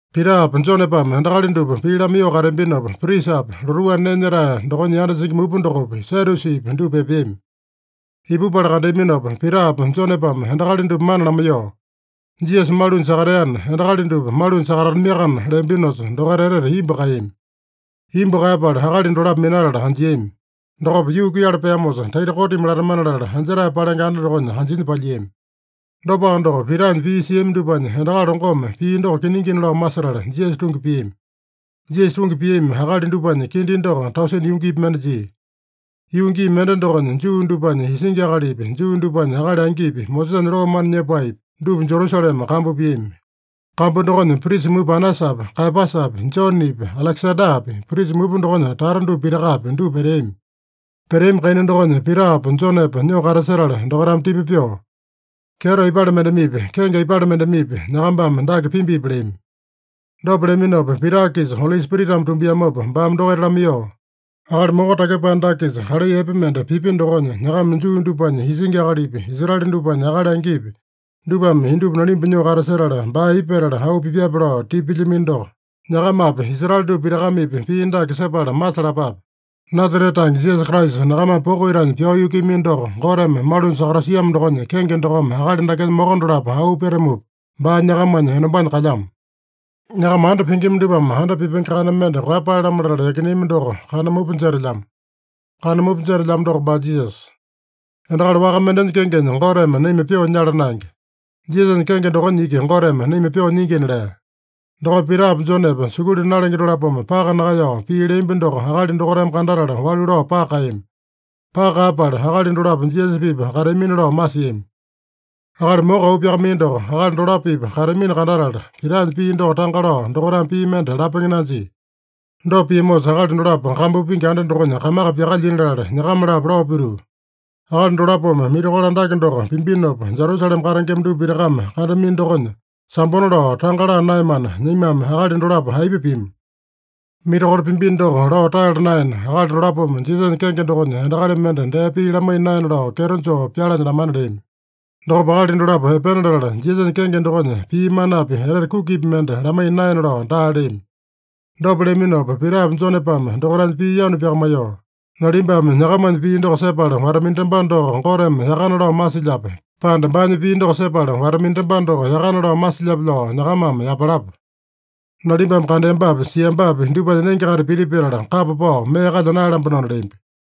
Pitapa Jonepame endakali dupa pii lamaiyoo kateambinopa, prisapi, lotuu anda nee nyetae dokonya yanda singi mupa dokopi, Sadyusipi dupa epeami. Ipupala kandeaminopa, Pitapa Jonepame endakali dupa mana lamaiyoo, “Jisasa malunya sakateana, endakali dupa malunya sakatatamiakana” leambinosa, dokaita etete imbu kaeyami. Imbu kaeyapala akali dolapo minatala anjiami. Dokopa yuu kuiyala peamosa, taita kotimi latamana latala anjetae palenge anda dokonya anjinya palyiami. Dopaka doko, Pitanya pii siami dupanya endakali longome pii doko kiningina lao masetala, Jisasa tungi piami. Jisasa tungi piami akali dupanya kindi doko tausene yungipi mende jia. Yuu gii mende dokonya Juu dupanya isingi akalipi, Juu dupanya akali angipi, Mosesanya loo mana nyepaepi, dupa Jerusalema kambu piami. Kambu dokonya prisa mupa Anasapi, Kaeyapasapi, Jonepi, Alekesandapi, prisa mupa dokonya tata dupa pitakapi, dupa peteami. Peteami kaina dokonya Pitapa Jonepa nyoo katasetala dokaitame tipa pyoo, “Kyeto aipale mendemepi, kenge aipale mendemepi, nyakambame dake pimbipi?” leami. Dopa leaminopa, Pita-kisa Oli Spiritame tumbiamopa baame dokaita lamaiyoo, “Akali moko takyepae dake-kisa kalai epe mende pipya dokonya, nyakama Juu dupanya isingi akalipi, Israele dupanya akali angipi, dupame indupa nalimba nyoo katasetala, baa aipa petala auu pipyape lao tipa pilyamino doko, nyakamapi, Israele dupa pitakamepi pii dake sepala masalapape: Nasarete tange Jisasa Kraisa, nyakamame poko itanya pyao yukuiyamino doko, Goteme malunya sakatasiamo dokonya kenge dokome akali dakenya moko dolapo auu petamupa, baa nyakamanya enombanya kalyamo. Nyakama anda pingima dupame anda pipenge kana mende koeyapae-lamo latala yakineami doko, kana mupa jetelyamo. Kana mupa jetelyamo doko baa Jisasa. Endakali waka mendenya kengenya Goteme naima pyoo nyala naenge. Jisasanya kenge dokonya iki Goteme naima pyoo nyingina” lea. Dokopa Pitapa Jonepa sukulu nalenge dolapome paka nakaeyao pii leambi doko akali dokaitame kandatala walu lao paka kaeyami. Paka kaeyapala, akali dolapo Jisasa-pipa kateamina lao masiami. Akali moko auu pyakamaiya doko akali dolapo-pipa kateamino kandatala, Pitanya pii doko tanga lao, dokaitame pii mende lapenge nanjia. Dopa piamosa, akali dolapo kambu pingi anda dokonya kamaka pyakalyina latala, nyakama-lapo lao pituu, “Akali dolapome mirakolo andake doko pimbinopa, Jerusalema katengema dupa pitakame kandamino dokonya, sambona lao tanga laa naeyamana, naimame akali dolapo aipa pima? Mirakolo pimbino doko lao taeyala naena, akali dolapome Jisasanya kenge dokonya endakali mende dee pii lamaiya naena lao kyeto joo pyalanya lamana” leami. Dokopa akali dolapo epena latala, Jisasanya kenge dokonya pii manapi etete kukipi mende lamaiya naena lao daa leami. Dopa leaminopa, Pitapa Jonepame dokaitanya pii yanu pyakamaiyoo, “Nalimbame nyakamanya pii doko sepala wata-minatambano doko Goteme yakana lao masilyape, pande baanya pii doko sepala wata-minatambano doko yakana lao masilyape lao nyakamame yapalapa. Nalimbame kandeambapi, siambapi dupanya nenge-kaita piti petala, kapa pao mee kalya naeyalambanona” leambi.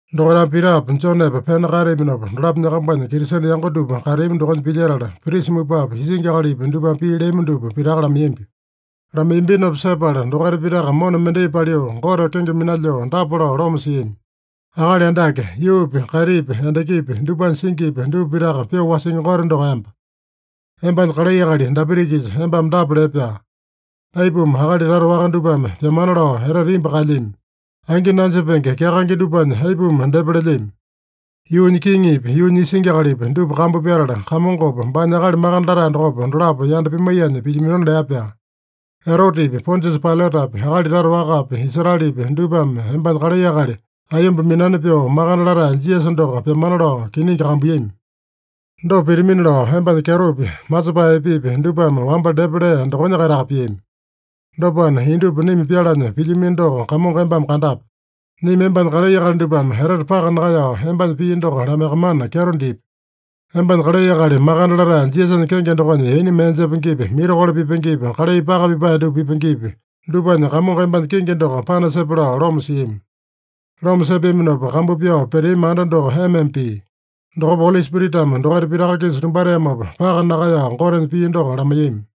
Dokaitame Pitapa Jonepa pena kaeteaminopa, dolapo nyakambanya Kristene yango dupa kateami dokonya pilyetala, prisa mupapi, isingi akalipi dupame pii leami dupa pitaka lamaiyambi. Lamaiyambinopa sepala dokaita pitaka mona mendai paliu, Gote kenge minalyoo dapa lao loma siami: “Akali Andake, yuupi, kaitipi, endakipi, dupanya singipi, dupa pitaka pyoo wasingi Gote doko emba. Embanya kalai akali Dapita-kisa embame dapa lee-pyaa: ‘Aipuma akali tata waka dupame pyamana lao etete imbu kaelyami? Angi nanjepenge kyakaenge dupanya aipuma depa lelyami? Yuunya kiŋipi, yuunya isingi akalipi, dupa kambu pyatala, Kamongopa, baanya Akali Makande Latae dokopa, dolapo yanda pimaiyanya pilyaminona’ lea-pyaa. Erotepi, Pondiasa Pailatapi, akali tata wakapi, Israelepi, dupame embanya kalai akali, aiyomba minani pyoo makande latae Jisasa doko pyamana lao kiningi kambuiyami. Dopa pitamina lao, embanya kyetopi, masepae epepi dupame wamba depa lee dokonya-kaitaka piami. Dopana, indupa naima pyalanya pilyamino doko Kamongo embame kandape. Naima embanya kalai akali dupame etete paka nakaeyao, embanya pii doko lamaiyakamana kyeto dipi. Embanya kalai akali makande latae Jisasanya kenge dokonya yaina mee jepengepi, mirakolo pipengepi, kalai paka pipae dupa pipengepi, dupanya Kamongo embanya kingi doko panasepe” lao loma siami. Loma sepeaminopa, kambu pyao peteami anda doko ema-ema pia. Dokopa Oli Spiritame dokaita pitaka-kisa tumbateamopa, paka nakaeyao Gotenya pii doko lamaiyami.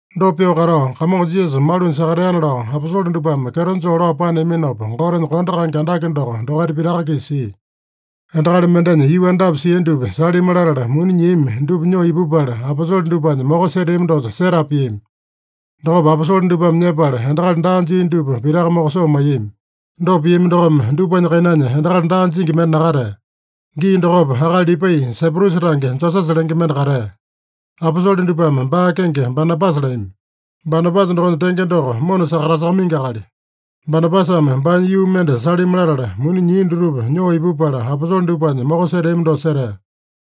Dopa pyoo katao, Kamongo Jisasa malunya sakateana lao, aposole dupame kyeto joo lao paneaminopa, Gotenya kondo kaenge andake doko dokaita pitaka-kisa sia. Endakali mendenya yuu andapi sia dupa salimi latala, muni nyiami dupa nyoo ipupala, aposole dupanya moko seteami dosa setapa piami. Dokopa aposole dupame nyepala, endakali daa jia dupa pitaka mokosoo maiyami. Dopa piami dokome, dupanya kainanya endakali daa jingi mende nakatea. Gii dokopa akali Lipai, Saiprusa tange Josesa lenge mende katea. Aposole dupame baa kenge Banabasa leami. (Banabasa dokonya tenge doko, Mona sakatasakamaingi akali.) Banabasame baanya yuu mende salimi latala, muni nyia dutupa nyoo ipupala, aposole dupanya moko seteami dosa setea.